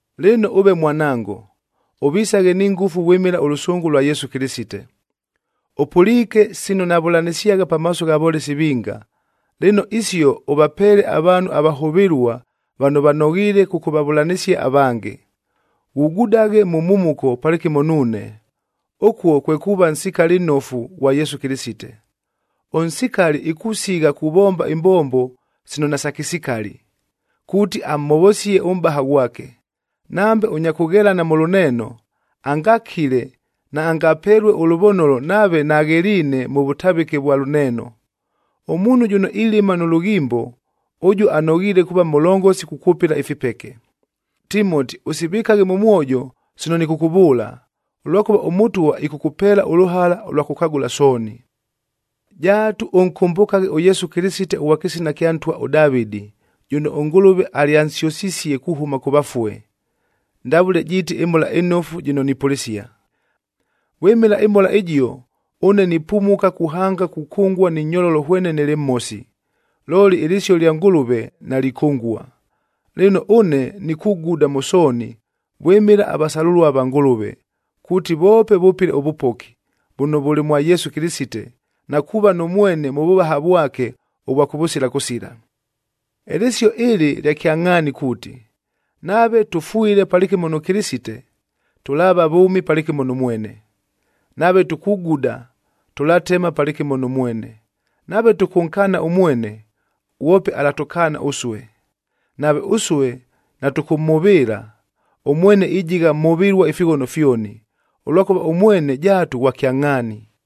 Lɨno ʉve mwanango, ʉvisaghe ni ngʉfu vwɨmɨla ʉlʉsʉngʉ lwa Yesu Kɨlɨsite. Ʉpʉliike sino navʉlanɨsyagha pamaaso gha volesi vinga, lɨno isio ʉvapeele avaanhu avahʉvɨlua vano vanoghiile kʉkʉvavʉlanɨsia avange. Ghugudaghe mʉ mhumuko palɨkɨmo nuune, ʉkuo kwe kuuva nsikali nnofu ghwa Yesu Kɨlɨsite. Ʉnsikali ikusigha kuvomba imbombo sino nasakɨsikali, kuuti amhovosie ʉmʼbaha ghwake. Nambe ʉnya kʉghelana mʉ lʉneeno, angakile, naangapelue ʉlʉvonolo nave nagheliine mʉ vʉtavɨke vwa lʉneeno. Ʉmuunhu jʉno ilɨma nʉ lʉghimbo, ʉjuo anoghiile kuuva mʉlongosi kukwʉpɨla ifipeke. Timoti, ʉsivɨkaghe mʉ mwojo sino nɨkʉkʉvʉʉla, ʉlwakʉva ʉMʉtwa ɨkʉkʉpeela ʉlʉhala ʉlwa kʉkagʉla sooni. Jaatu ʉnkʉmbʉkaghe ʉYesu Kɨlɨsite ʉghwa kɨsina kya ntwa ʉDavɨdi,ab jʉno ʉNgʉlʉve alyansyʉsisie kuhʉma kʉ vafue, ndavʉle jiiti ɨMhola ɨNofu jɨno nipʉlɨsia. Vwɨmɨla ɨMhola ɨjio, ʉne nipumuka kuhanga kukʉngua ni nyololo hwene nɨlɨ mhosi. Looli ɨlɨsio lya Ngʉlʉve nalikʉngua. Lɨno, ʉne nikuguda mʉ sooni vwɨmɨla avasalʉlua va Ngʉlʉve, kuuti voope vʉpɨle ʉvʉpoki, vʉno vʉlɨ mwa Yesu Kɨlɨsite, na kuuva nʉ mwene mʉ vʉvaha vwake ʉvwa kʉvʉsila kʉsila. Ɨlɨsio ɨlɨ lya kyangʼhaani kuuti, “Nave tʉfwile palɨkɨmo nʉ Kɨlɨsite, tʉlaava vʉʉmi palɨkɨmo nʉ mwene. Nave tukuguda, tʉlatema palɨkɨmo nʉ mwene. Nave tʉkʉnkaana ʉmwene, ghwope alatʉkaana ʉsue. Nave ʉsue natʉkʉmhʉvɨɨla, ʉmwene ijigha mhʉvɨlua ifighono fyoni, ʉlwakʉva ʉmwene jaatu ghwa kyangʼhaani.”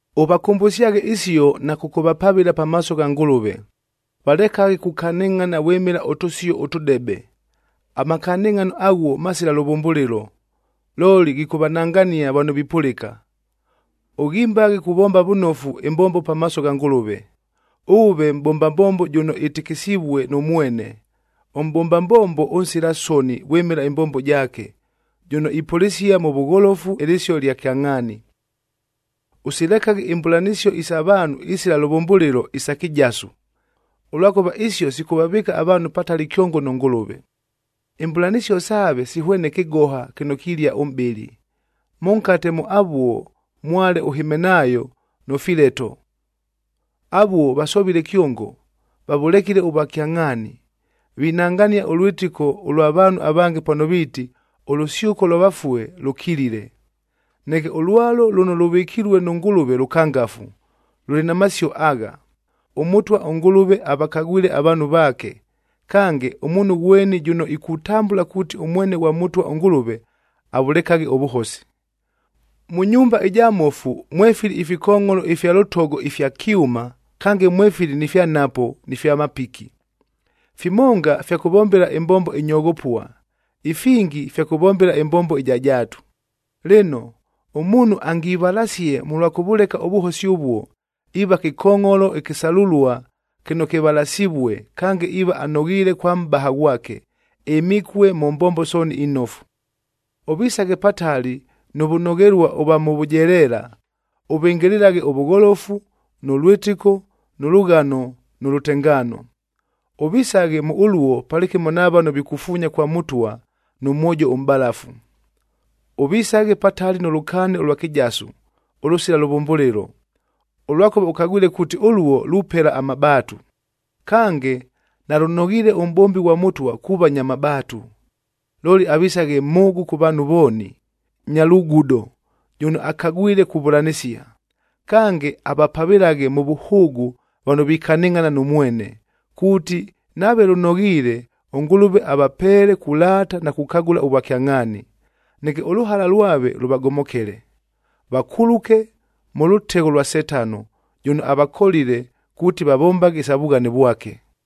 Ʉvakʉmbʉsyaghe isio na kʉkʉvapavɨla pamaaso gha Ngʉlʉve, valekaghe kukanɨngʼhana vwɨmɨla ʉtʉsio ʉtʉdebe. Amakanɨngʼhano aghuo masila lʉvʉmbʉlɨlo, looli ghikʉvanangania vano vipʉlɨka. Ʉghimbaghe kuvomba vʉnofu ɨmbombo pamaaso gha Ngʉlʉve. Ʉʉve mʼbomba mbombo jʉno ɨtɨkɨsivue nʉ mwene, ʉmʼbomba mbombo ʉnsila soni vwɨmɨla ɨmbombo jaake, jʉno ipʉlɨsia mʉ vʉgholofu ɨlɨsio ɨlya kyangʼhaani. Ʉsilekaghe imbʉlanɨsio isa vaanhu isila lʉvʉmbʉlɨlo, isa kɨjasu, ʉlwakʉva isio sikʉvavɨɨka avaanhu patali kyongo nʉ Ngʉlʉve. Imbʉlanɨsio saave sihwene kɨgoha kɨno kilia ʉmʼbɨlɨ. Mʉnkate mʉ avuo mwale ʉHimenaayo nʉ Fileto, avuo vasovile kyongo, vavʉlekile ʉvwakyangʼhaani. Vinangania ʉlwɨtɨko ʉlwa vaanhu avange pano viiti, ʉlʉsyʉko lwa vafue lʉkilile. Neke ʉlwalo lʉno lʉvɨkilue nʉ Ngʉlʉve lʉkangafu, lʉlɨ na masio agha, “ɄMʉtwa ʉNgʉlʉve avakagwile avaanhu vaake,”c kange, “Ʉmuunhu ghweni jʉno ikutambʉla kuuti ʉmwene ghwa Mʉtwa ʉNgʉlʉve, avʉlekaghe ʉvʉhosi.” Mʉ nyumba ɨja mmofu mwefili ifikongʼholo ifya lʉtogo ifya kyʉma, kange mwefili ni fya nhapo ni fya mapiki. Fimonga fya kʉvombela ɨmbombo ɨnyoghopua, ifingi fya kʉvombela ɨmbombo ɨja jaatu. Lɨno, ʉmuunhu angivalasie mʉlwa kʉvʉleka ʉvʉhosi ʉvuo, iiva kɨkongʼholo ɨkɨsalʉlua kɨno kɨvalasivue, kange iiva anoghiile kwa Mʼbaha ghwake, ɨmikue mʉ mbombo sooni inofu. Ʉvisaghe patali nʉ vʉnoghelua ʉvwa mʉ vʉjeleela, ʉvɨngɨlɨlaghe ʉvʉgholofu, nʉ lwɨtɨko, nʉ lʉghano nʉ lʉtengaano. Ʉvisaghe mʉ ʉluo palɨkɨmo na vano vikufuunya kwa Mʉtwa nʉ mwojo ʉmʼbalafu. Ʉvisaghe patali nʉ lʉkaani ʉlwa kɨjasu ʉlʉsila lʉvʉmbʉlɨlo, ʉlwakʉva ʉkagwile kuuti ʉluo lupela amabaatu. Kange, nalʉnoghiile ʉmʼbombi ghwa Mʉtwa kuuva nya mabaatu. Looli, avisaghe mhʉʉgʉ kʉ vaanhu vooni, nya lugudo, jʉno akagwile kuvʉlanɨsia. Kange, avapavɨlaghe mʉ vʉhʉʉgʉ vano vikanɨngʼhana nʉ mwene, kuuti nave lʉnoghiile, ʉNgʉlʉve avapeele kulaata na kukagʉla ʉvwakyangʼhaani. Neke, ʉlʉhala lwave lʉvagomokele, vakuluke mʉ lʉtegho lwa Setano, jʉno avakolile kuuti vavombaghe isa vughane vwake.